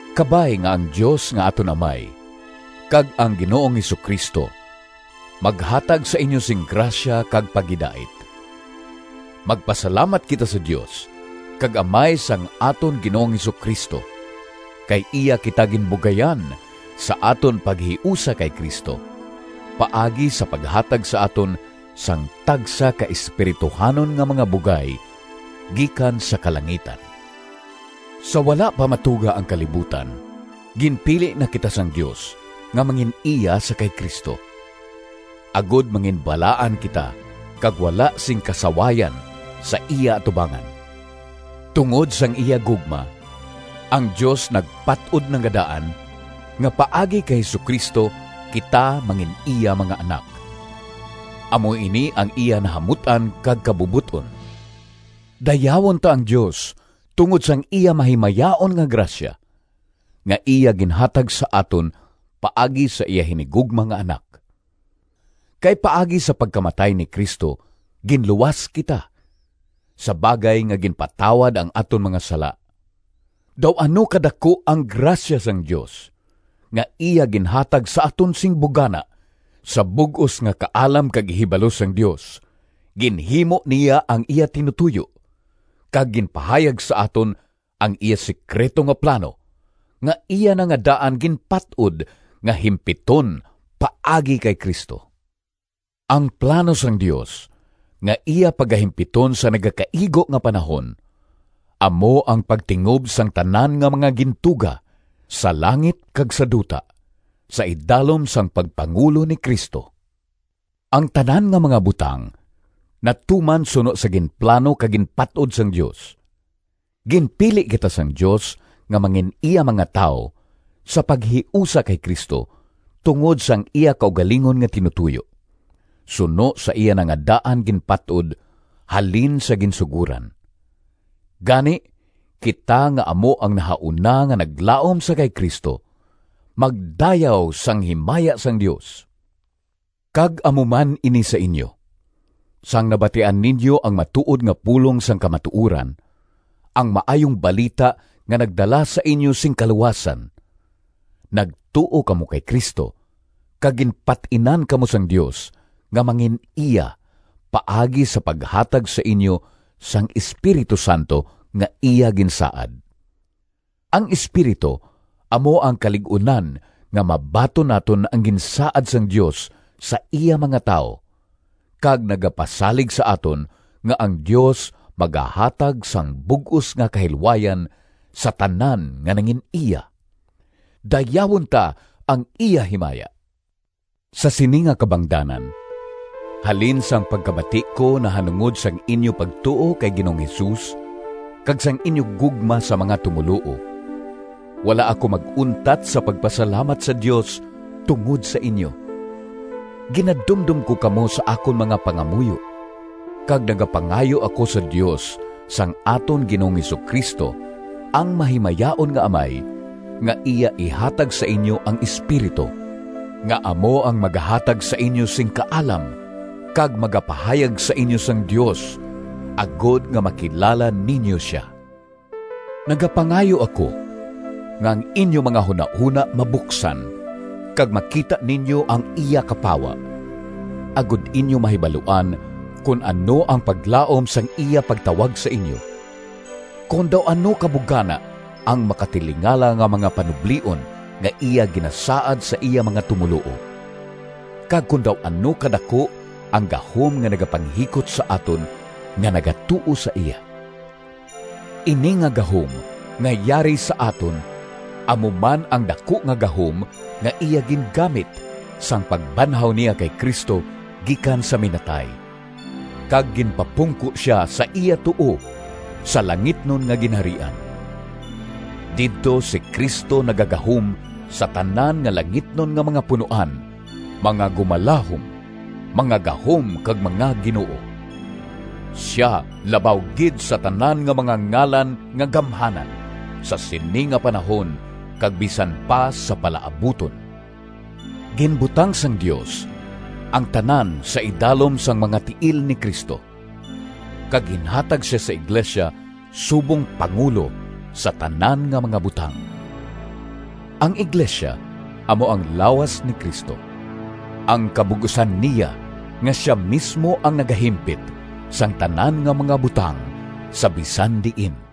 Kabay nga ang Dios nga aton Amay kag ang Ginoong Jesu-Cristo maghatag sa inyo sing grasya kag paghidait. Magpasalamat kita sa Dios kag Amay sang aton Ginoong Jesu-Cristo! Kay iya kita ginbugayan sa aton paghiusa kay Cristo, paagi sa paghatag sa aton sang tagsa ka espirituhanon nga mga bugay gikan sa kalangitan. Sa wala pa matuga ang kalibutan, ginpili na kita sang Dios nga mangin-iya sa kay Cristo, agod manginbalaan kita kag wala sing kasawayan sa iya atubangan. Tungod sang iya gugma, ang Dios nagpat-od na nga daan nga paagi kay Jesu-Cristo, kita mangin-iya mga anak. Amo ini ang iya nahamut-an kag kabubot-on. Dayawon ta ang Dios tungod sang iya mahimayaon nga grasya, nga iya ginhatag sa aton paagi sa iya hinigugma nga Anak! Kay paagi sa pagkamatay ni Cristo ginluwas kita, sa bagay nga ginpatawad ang aton mga sala. Daw ano kadaku ang grasya sang Dios, nga iya ginhatag sa aton sing bugana! Sa bug-os nga kaalam kag ihibalo sang Dios ginhimo niya ang iya tinutoyo, kag ginpahayag sa aton ang iya sekrito nga plano, nga iya na nga daan ginpat-od nga himpiton paagi kay Cristo. Ang plano sang Dios nga iya pagahimpiton sa nagakaigo nga panahon, amo ang pagtingob sang tanan nga mga gintuga, sa langit kag sa duta, sa idalom sang pagpangulo ni Cristo. Ang tanan nga mga butang natuman suno sa ginplano kag ginpat-od sang Dios. Ginpili kita sang Dios nga mangin-iya mga tawo sa paghiusa kay Cristo tungod sang iya kaugalingon nga tinutoyo, suno sa iya na nga daan ginpat-od halin sa ginsugoran. Gani, kita nga amo ang nahauna nga naglaom sa kay Cristo, magdayaw sang himaya sang Dios! Kag amo man ini sa inyo: sang nabatian ninyo ang matuod nga pulong sang kamatuoran, ang Maayong Balita nga nagdala sa inyo sing kaluwasan, nagtuo kamo kay Cristo, kag ginpat-inan kamo sang Dios nga mangin-iya paagi sa paghatag sa inyo sang Espiritu Santo nga iya ginsaad. Ang Espiritu amo ang kalig-unan nga mabaton naton ang ginsaad sang Dios sa iya mga tawo, kag nagapasalig sa aton nga ang Dios magahatag sang bug-os nga kahilwayan sa tanan nga nangin-iya. Dayawon ta ang iya himaya! Sa sini nga kabangdanan, halin sang pagkabati ko nahanungod sang inyo pagtuo kay Ginoong Jesus kag sang inyo gugma sa mga tumoluo, wala ako mag-untat sa pagpasalamat sa Dios tungod sa inyo. Ginadumdom ko kamo sa akon mga pangamuyo, kag nagapangayo ako sa Dios sang aton Ginoong Jesu-Cristo, ang mahimayaon nga Amay, nga iya ihatag sa inyo ang Espiritu, nga amo ang magahatag sa inyo sing kaalam kag magapahayag sa inyo sang Dios, agod nga makilala ninyo sia. Nagapangayo ako nga ang inyo mga hunahona mabuksan kag makita ninyo ang iya kapawa, agod inyo mahibaluan kon ano ang paglaom sang iya pagtawag sa inyo, kon daw ano ka bugana ang makatilingala nga mga panublion nga iya ginasaad sa iya mga tumoluo, kag kon daw ano ka daku ang gahom nga nagapanghikot sa aton nga nagatuo sa iya. Ini nga gahom nga yari sa aton amo man ang daku nga gahom, nga iya gingamit sang pagbanhaw niya kay Cristo gikan sa minatay, kag ginpapungko siya sa iya tuo sa langitnon nga ginharian. Didto si Cristo nagagahom sa tanan nga langitnon nga mga punoan, mga gumalahom, mga gahom kag mga ginoo. Sia labaw gid sa tanan nga mga ngalan nga gamhanan sa sini nga panahon kag bisan pa sa palaabuton. Ginbutang sang Dios ang tanan sa idalom sang mga tiil ni Cristo, kag ginhatag sia sa iglesia subong Pangulo sa tanan nga mga butang. Ang iglesia amo ang lawas ni Cristo, ang kabug-osan niya nga sia mismo ang nagahimpit sang tanan nga mga butang sa bisan diin.